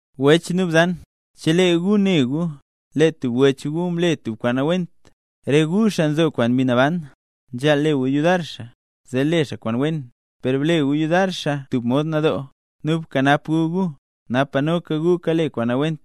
Wech nu bzan, chelee gu ne gu, lee tub wech gu mle tub kwaan nawent, re gu xaa nzo kwaan Mbi Naban, nzhaal le gu yudar xaa, zee le xaa kwaan wen; per ble gu yudar xaa tub mod nadoo. Nu bkanap gu gu, napa noka gu kale kwaan nawent.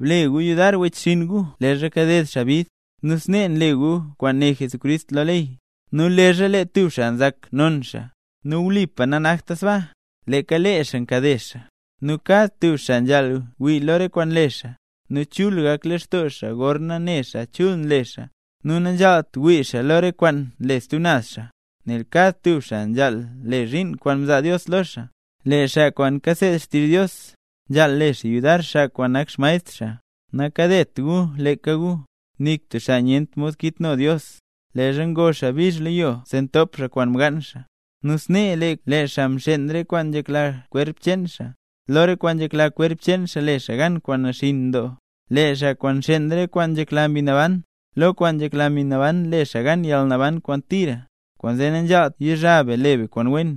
Ble gu yudar wechxinn gu leezha kaded xaa bid, nu snee nle gu kwaan né Jesucrist lo ley. Nu leezha lee tub xaa nzak non xaa, nu wlipa nanakta sbaa, leeka lee xaa kakade xaa. Nu kad tub xaa nzhaal wii lo re kwaan nle xaa, nu chul gak lextoo xaa gorna ne xaa chul nle xaa, nu nanzhaalt wii xaa lo re kwaan nle stub naz xaa. Nel kad tub xaa nzhaal le zhiin kwaan mzaa Dios lo xaa. Lee xaa kwaan kaseed xtizh Dios, nzhaal le xaa yudar xaa kwaan nak xmaestr xaa. Nakadet gu leeka gu, nik tub xaa nyent mod kitno Dios. Leezha ngo xaa bizh lo yo zee ntop xaa kwaan mgaan xaa. Nu snee lee xaa nxeen re kwaan nzhekla kwerp cheen xaa, lo re kwaan nzhekla kwerp cheen xaa le xaa gan kwaan naxinn doo. Lee xaa kwaan nxeen re kwaan nzhekla Mbi Naban, lo kwaan nzhekla Mbi Naban le xaa gan yalnaban kwaan tira. Kwaanzee nanzhaalt yizha be le be kwaan wen,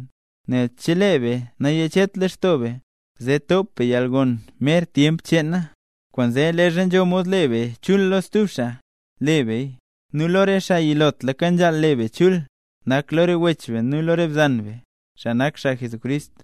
nel chelee be nayachet lextoo be, zee top be yalgon mer tyemp nak cheena. Kwaanzee, leezha nzho mod le be chul lo stub xaa, le beya, nu lo re xaa yilotlaka nzhaal le be chul, nak lo re wech be nu lo re bzan be, xaa nak xaa Jesucrist.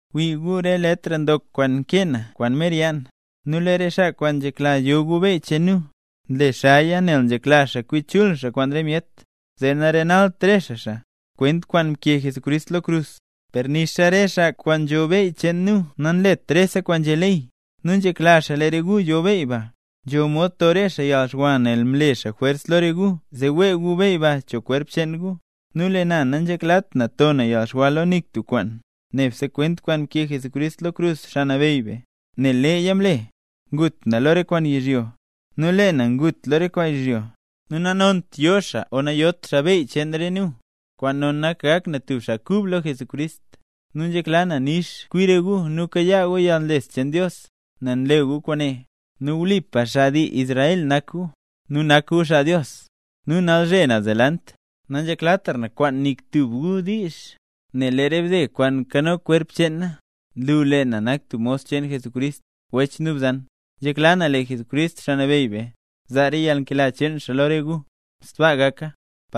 ¡Wii gu re letr ndok kwaan nkee na kwaan mer yaa na! Nu lee re xaa kwaan nzhekla yo gu beyy cheen nu, nle xaaya nel nzhekla xaa kwi chul xaa kwaan re myet, zee narenalt re xaa xaa, kwent kwaan mkee Jesucrist lo krus. Per nixa re xaa kwaan nzho beyy cheen nu nanlet rese kwaan nzhé ley. Nu nzhekla xaa lee re gu yo beyy ba, zee nzho mod to re xaa yalxwa nel mle xaa jwers lo re gu zee wee gu beyy ba cho kwerp cheen gu. Nu lee na nanzheklat na to na yalxwa lo nik tub kwaan, nebse kwent kwaan mkee Jesucrist lo krus, Xaa Nabeyy be. Nel leeya mle, ngut na lo re kwaan yizhyo, zee nanabeyytra lo na. Nu nanont yo xaa o nayot xaa beyy cheen re nu, kwaan non nak gak na tub xaa kub lo Jesucrist. Nu nzhekla na nix kwi re gu nu kayaa gu yalnles cheen Dios, nel nle gu kwaane, nu wlipa xaa dii cheen Israel nak gu, nu nak gu xaa Dios. Nu nalzhe naz delant, nanzheklatra na nik tub xaa kwaan diizh, nel lee re bde kwaan nkano kwerp cheen na, nlu lee na nak tub mos cheen Jesucrist. Wech nu bzan, nzhekla na lee Jesucrist, Xaa Nabeyy be, zaa re yalnkela cheen xaa lo re gu. ¡Sbaa gaka!